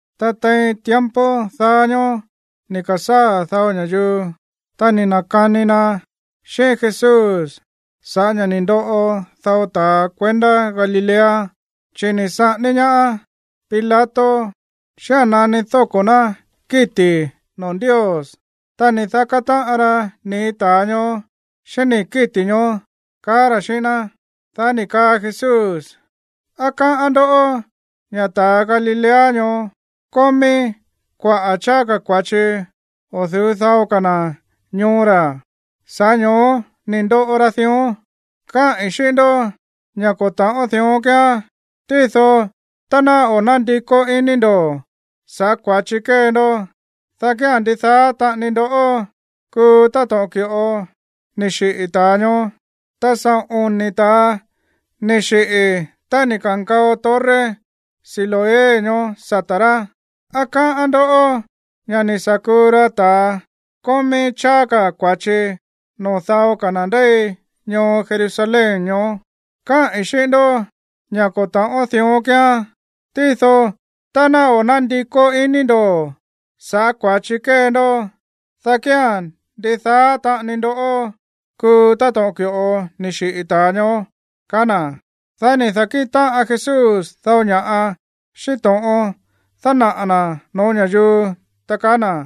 Ta tein tiempo daá ñóó ni̱ ka̱sáa̱ dao ña̱yuu, ta ni̱ na̱kani na xíꞌín Jesús sa̱ꞌá ña̱ ni̱ ndoꞌo dao ta̱a kuendá Galilea, chi̱ ni̱ saꞌání ñaá Pilato xía̱n nani dóko̱ rá kíti̱ noo̱ Ndios, ta ni̱ daká táꞌan ra nii̱ ta̱a ñoó xíꞌín nii̱ kíti̱ ñoó, kaá ra̱ xíꞌín ná. Dá ni̱ kaa Jesús: ―¿Á káꞌán ndó ña̱ ta̱ Galilea ñoó kómí kuaꞌa̱ cháá ka̱ kua̱chi o̱ du̱ú dao ka̱ na̱ ñoo ra̱, sa̱ꞌá ño̱ó ni̱ ndoꞌo ra dión? Káꞌi̱n xíꞌín ndó ña̱ ko̱ ta̱ꞌón dión kíán. Tído tá ná o̱ nándikó iní ndo̱ sa̱ꞌá kua̱chi kée ndó, dá kía̱n ndidaá taꞌani ndó kuu táto̱ꞌon ki̱ꞌo ni̱ xiꞌi̱ ta̱a ñoó. Ta saꞌo̱n oni̱ ta̱a ni̱ xiꞌi̱ tá ni̱ ka̱nkao torre Siloé ñoó sata̱ rá. ¿Á káꞌán ndó ña̱ ni̱ sa̱ kuu ra ta̱ kómí cháá ka̱ kua̱chi noo̱ dao ka̱ na̱ ndéi ñoo Jerusalén ñoó? Káꞌi̱n xíꞌín ndó ña̱ ko̱ ta̱ꞌón dión kíán, tído tá ná o̱ nándikó iní ndo̱ sa̱ꞌá kua̱chi kée ndó, dá kía̱n ndidaá taꞌani ndó kuu táto̱ꞌon ki̱ꞌo ni̱ xiꞌi̱ ta̱a ñoó ―kaá na̱. Dá ni̱ da̱kíꞌin táꞌan Jesús dao ña̱ꞌa xíꞌín to̱ꞌon dánaꞌa̱ na̱ no̱ó ña̱yuu, ta kaá na̱: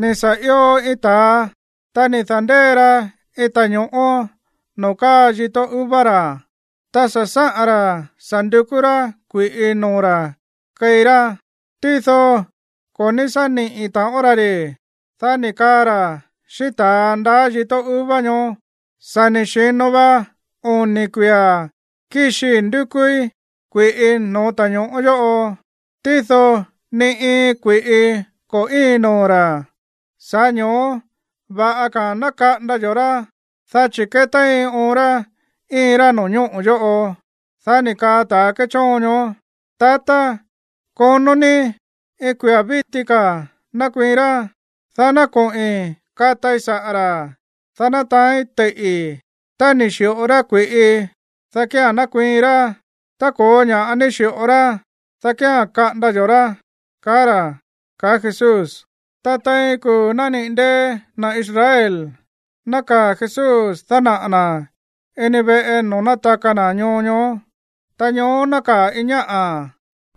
―Ni̱ sa̱ io iin ta̱a, ta ni̱ da̱ndée ra iin ta̱ño̱ꞌó noo̱ káa yíto̱ uva ra̱. Ta sa̱ sáꞌa̱n ra̱ sa̱ ndukú rá kui̱ꞌi noo̱ ra̱ keí rá. Tído ko̱ ní sá niꞌi̱ taꞌon ra ri̱. Dá ni̱ kaa ra̱ xíꞌín ta̱a ndaá yíto̱ uva ñoó: “Sa̱ ni̱ xi̱no va oni̱ kuia̱ kíxii ndukúí kui̱ꞌi no̱ó ta̱ño̱ꞌó yóꞌo, tído ni iin kui̱ꞌi ko̱ íin noo̱ ra̱. Sa̱ꞌá ño̱ó va̱ꞌa ka̱a̱n ná kaꞌanda yo̱ꞌó ra̱, dá chi̱ kétéin oon rá íin rá no̱ñóꞌo̱ yóꞌo.” Dá ni̱ kaa ta̱a kéchóon ñoó: “Tatá, konó ní iin kuia̱ víti ka̱ nákuiin rá, dá ná koꞌi̱n katai saꞌa̱ ra̱, dá ná taáín teiꞌi̱. Tá ni̱ xi̱ꞌo rá kui̱ꞌi, dá kía̱n nakuiin rá. Tá ko̱ó ña̱ꞌá ní xi̱ꞌo rá, dá kía̱n kaꞌanda yo̱ rá”, kaá ra̱ ―kaá Jesús. Tein iin kuu̱ nániꞌi̱ ndée̱ na̱ Israel, nákaa̱ Jesús dánaꞌa̱ na̱ ini veꞌe noo̱ nátaka na̱ ñoo ñoó. Ta ñoó nákaa̱ iin ñáꞌa̱,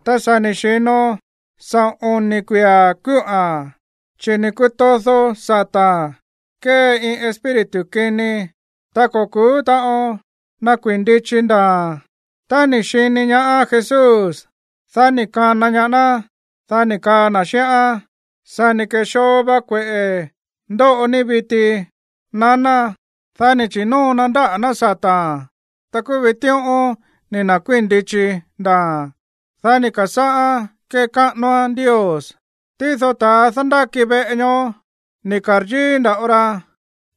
ta sa̱ ni̱ xi̱no saꞌo̱n oni̱ kuia̱ kúꞌa̱n, chi̱ ni̱ kutódo sa̱ta̱n kée iin espíritu kini. Ta ko̱ ku̱ú taꞌon nakuii̱n ndichi ndaa̱a̱n. Tá ni̱ xini ñaá Jesús, dá ni̱ kana ñaá ná. Dá ni̱ kaa na̱ xíꞌán: ―Sa̱ ni̱ ke̱xoo va kueꞌe̱ ndóꞌo ní viti, naná. Dá ni̱ chi̱nóo na ndáꞌa̱ ná sa̱ta̱n. Ta kúú vitíꞌón ni̱ na̱kuíi̱n ndichi ndaa̱a̱n. Dá ni̱ ka̱sáꞌán kekáꞌanoán Ndios. Tído ta̱a dándáki veꞌe ñoó, ni̱ ka̱ryíí nda̱ꞌo ra,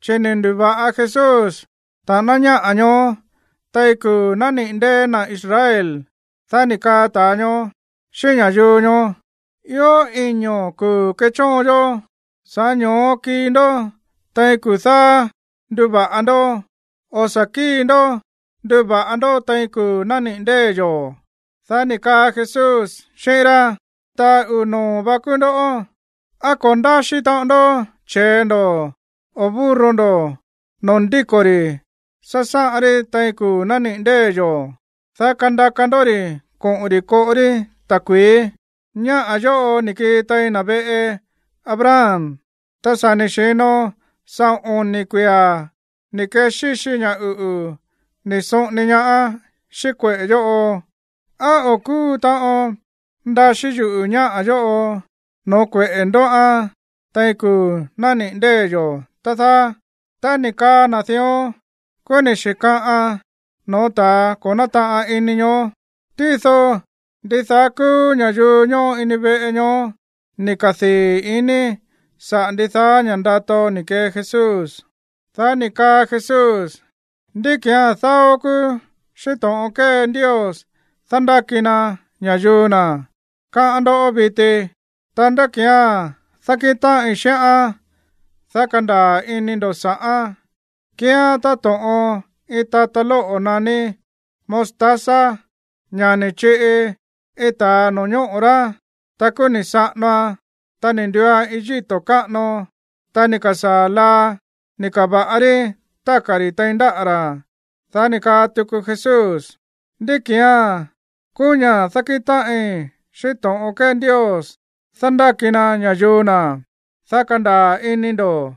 chi̱ ni̱ ndu̱va̱ꞌa Jesús ta̱ꞌáná ñáꞌa̱ ñoó tein kuu̱ nániꞌi̱ ndée̱ na̱ Israel. Dá ni̱ kaa ta̱a ñoó xíꞌín ña̱yuu ñoó: ―Ió iño̱ kuu̱ kéchóon yó. Sa̱ꞌá ño̱ó kii ndó tein kuu̱ dáá nduva̱ꞌa ndó. O̱ sa̱ kíi ndó nduva̱ꞌa ndó tein kuu̱ nániꞌi̱ ndée̱ yo̱. Dá ni̱ kaa Jesús xíꞌín rá: ―Ta̱a uu̱ noo̱ vá kúú ndó. ¿Á ko̱ ndáxí taꞌon ndó che̱e ndo̱ o burro ndo̱ noo̱ ndíko̱ ri̱ sasáꞌan rí tein kuu̱ nániꞌi̱ ndée̱ yo̱, dá kandaka ndó ri̱ koꞌo̱n ri̱ koꞌo rí ta̱kui̱í? Ñáꞌa̱ yóꞌo ni̱ kii tein na̱ veꞌe Abraham, ta sa̱ ni̱ xi̱no saꞌo̱n oni̱ kuia̱ ni̱ kexíxi ña̱ uꞌu̱ ni̱ soꞌoni ñaáán xíꞌín kueꞌe̱ yóꞌo. ¿Á o̱ kúu taꞌon ndaxí yuꞌu̱ ñáꞌa̱ yóꞌo no̱ó kueꞌe̱ ndóꞌán tein kuu̱ nániꞌi̱ ndée̱ yo̱, tá dáá? Tá ni̱ kaa na̱ dión, kúú ni̱ xi̱kaꞌan no̱ó ta̱a ko̱ nátaꞌan ini ñoó. Tído ndidaá kúú ña̱yuu ñóꞌo ini veꞌe ñoó ni̱ kadii̱ ini saꞌa̱ ndidaá ña̱ꞌa ndato ni̱ kee Jesús. Dá ni̱ kaa Jesús: ―¿Ndí ki̱án dáó kúú xíꞌín to̱ꞌon kée Ndios dándáki na ña̱yuu na̱, káꞌán ndó viti? Ta, ¿ndá ki̱án dákíꞌin táꞌin xíꞌán, dá kandaa̱ ini ndo̱ sa̱ꞌán? Kíán táto̱ꞌon iin tata lóꞌo̱ naní mostaza, ña̱ ni̱ chiꞌi iin ta̱a no̱ñóꞌo̱ rá, ta kúú ni̱ saꞌanoan, ta ni̱ nduuan iin yíto̱ káꞌano. Ta ni̱ ka̱sáa̱ laa ni̱ ka̱va̱ꞌa rí táka̱ ri̱ tein ndáꞌa̱ ra̱. Dá ni̱ kaa tuku Jesús: ―¿Ndí ki̱án kúú ña̱ dákíꞌin táꞌin xíꞌín to̱ꞌon kée Ndios dándáki na ña̱yuu na̱, dá kandaa̱ ini ndo̱?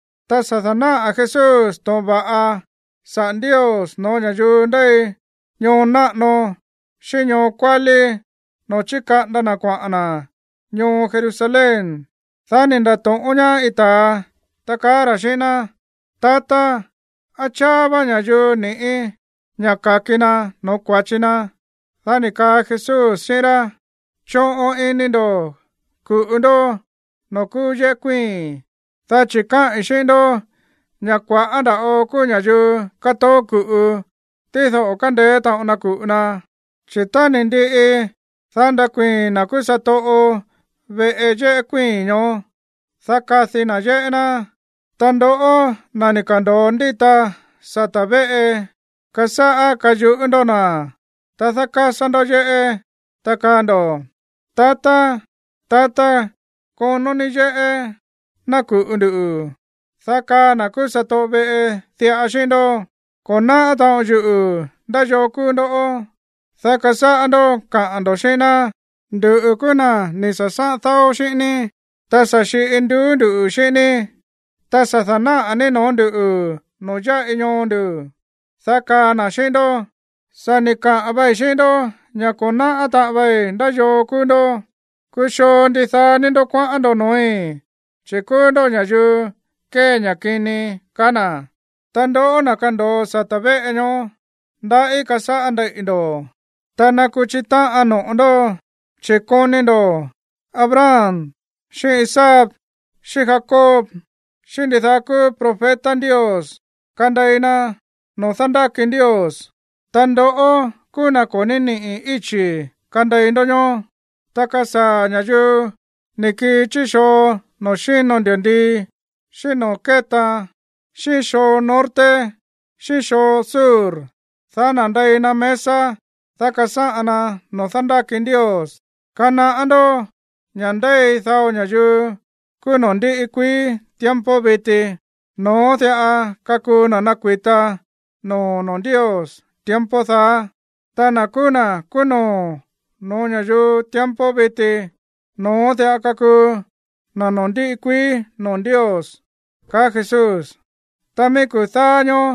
Ta sa̱ da̱náꞌa̱ Jesús to̱ꞌon va̱ꞌa saꞌa̱ Ndios no̱ó ña̱yuu ndéi ñoo náꞌano xíꞌín ñoo kuálí noo̱ chíkaꞌanda na̱ kuaꞌa̱n na̱ ñoo Jerusalén. Dá ni̱ nda̱to̱ꞌón ñaá iin ta̱a, ta kaá ra̱ xíꞌín ná: ―Tatá, ¿á cháá vá ña̱yuu ni̱ꞌí ña̱ ka̱ki na no̱ó kua̱chi na? Dá ni̱ kaa Jesús xíꞌín rá: ―Choꞌon ini ndo̱ ku̱ꞌu ndó noo̱ kúú yéꞌé kuíi̱n, dá chi̱ káꞌi̱n xíꞌín ndó ña̱ kua̱ꞌá ndava̱ꞌo kúú ña̱yuu katoó ku̱ꞌu, tído o̱ kándeé taꞌon na ku̱ꞌu na. Chi̱ tá ni̱ ndiꞌi, dá nakuii̱n na̱ kúú satoꞌo veꞌe yéꞌé kuíi̱n ñoó, dá kadi na̱ yéꞌé ná. Ta ndoꞌó, na̱ ni̱ ka̱ndo̱o ndíta sata̱ véꞌe, kasáꞌá kayuꞌú ndó na̱, ta dákásá ndó yéꞌé, ta kaa ndo̱: “Tatá, tatá, konó ní yéꞌé ná ku̱ꞌu nduꞌu̱.” Dá kaa na̱ kúú satoꞌo veꞌe diꞌa xíꞌín ndó: “Ko̱ náꞌá taꞌon yuꞌu̱ ndá yoo kúú ndó.” Dá kasáꞌá ndó kaꞌa̱n ndo̱ xíꞌín ná: “Nduꞌu̱ kúú na̱ ni̱ sa̱sáꞌan dáó xíꞌín ní, ta sa̱ xiꞌi nduú ndu̱ xíꞌín ní, ta sa̱ da̱náꞌa̱ ní noo̱ ndú noo̱ yáꞌi ñoo ndu̱.” Dá kaa na̱ xíꞌín ndó: “Sa̱ ni̱ kaꞌa̱n vei xíꞌín ndó ña̱ ko̱ náꞌá taꞌan vei ndá yoo kúú ndó. Kuxoo ndidaá ní ndó kuaꞌán ndo̱ noo̱í, chi̱ kúú ndó ña̱yuu kée ña̱ kini”, kaa na̱. Ta ndoꞌó, na̱ kando̱o sata̱ véꞌe ñoó, ndaꞌí kasáꞌá ndeiꞌi̱ ndo̱, ta nakuchi táꞌan no̱ꞌo ndó, chi̱ koni ndo̱ Abraham xíꞌín Isaac, xíꞌín Jacob xíꞌín ndidaá kúú profeta Ndios kandei na noo̱ dándáki Ndios, ta ndoꞌó kúú na̱ ko̱ ní niꞌi̱ íchi̱ kandei ndó ñoó. Ta kasaa̱ ña̱yuu ni̱ kii chí xoo noo̱ xíno ndi̱ndii, xíꞌín noo̱ kétaan, xíꞌín xoo norte xíꞌín xoo sur, dá nande̱i na mesa, dá kasáꞌan na noo̱ dándáki Ndios. Kanaꞌá ndó ña̱ ndéi dao ña̱yuu kúú noo̱ ndiꞌi kuií tiempo viti, no̱ón diꞌa kakuu na̱ nakui̱ta no̱ó noo̱ Ndios tiempo daá. Ta na̱ kúú na̱ kúú no̱ó no̱ó ña̱yuu tiempo viti, no̱ón diꞌa kakuu na̱ noo̱ ndiꞌi kuií noo̱ Ndios ―kaá Jesús. Ta mií kuu̱ dáá ñóó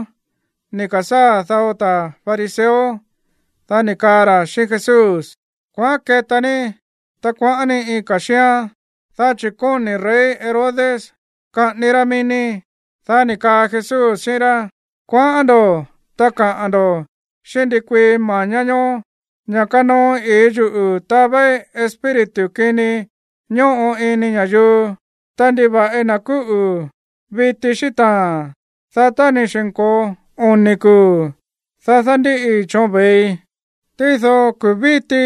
ni̱ ka̱sáa̱ dao ta̱ fariseo. Dá ni̱ kaa ra̱ xíꞌín Jesús: ―Kuaꞌán keta ní, ta kuaꞌán ní iin ka̱ xíán, dá chi̱ kóni̱ rey Herodes kaꞌání rá mií ní. Dá ni̱ kaa Jesús xíꞌín rá: ―Kuaꞌán ndo̱, ta kaꞌa̱n ndo̱ xíꞌín ndikuii mañá ñoó ña̱ kanoo i̱í yuꞌu̱ tavéí espíritu kini ñóꞌo ini ña̱yuu, ta nduva̱ꞌi na̱ kúꞌu̱ viti xíꞌín taa̱n, dá tá ni̱ xi̱nko̱o oni̱ kuu̱, dá dándíꞌi choon vei. Tído kuu̱ víti,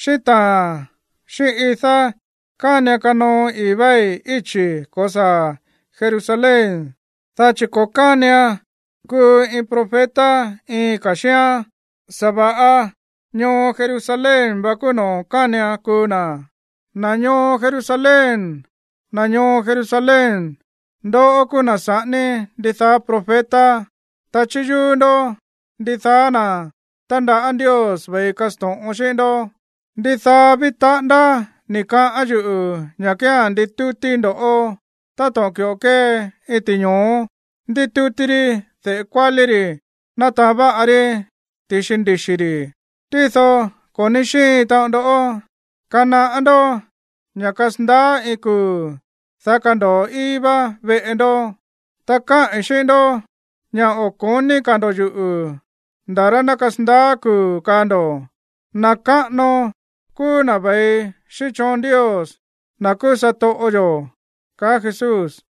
xíꞌín taa̱n, xíꞌín idá kánian kanoo i̱í váí íchi̱ ko̱saa̱ Jerusalén, dá chi̱ ko̱ kánian kuu iin profeta iin ka̱ xíán, sa̱va̱ꞌa ñoo Jerusalén vá kúú noo̱ kánian kuu na̱. ¡Na̱ ñoo Jerusalén, na̱ ñoo Jerusalén, ndoꞌó kúú na̱ saꞌání ndidaá profeta, ta chíyúú ndó ndidaá na̱ tándaꞌá Ndios ve̱i kasto̱ꞌon xíꞌín ndó! ¡Ndidaá ví taꞌándá ni̱ kaꞌán yuꞌu̱ ña̱ kía̱n nditútíí ndoꞌó táto̱ꞌon ki̱ꞌo kée iin ti̱ño̱ó ndítútí rí de̱ꞌe kuálí ri̱ nátaán váꞌa rí ti̱xi ndixi̱ ri̱, tído ko̱ ní xíin taꞌon ndó! Kanaꞌá ndó ña̱ kasandaá iin kuu̱, dá kando̱o íí vá veꞌe ndó. Ta káꞌi̱n xíꞌín ndó ña̱ o̱ ko̱ní ka̱ ndo̱ꞌó yuꞌu̱ nda̱ rá ná kasandaá kuu̱ kaa ndo̱: “Na̱ káꞌano kúú na̱ ve̱i xíꞌín choon Ndios, na̱ kúú satoꞌo yo̱” ―kaá Jesús.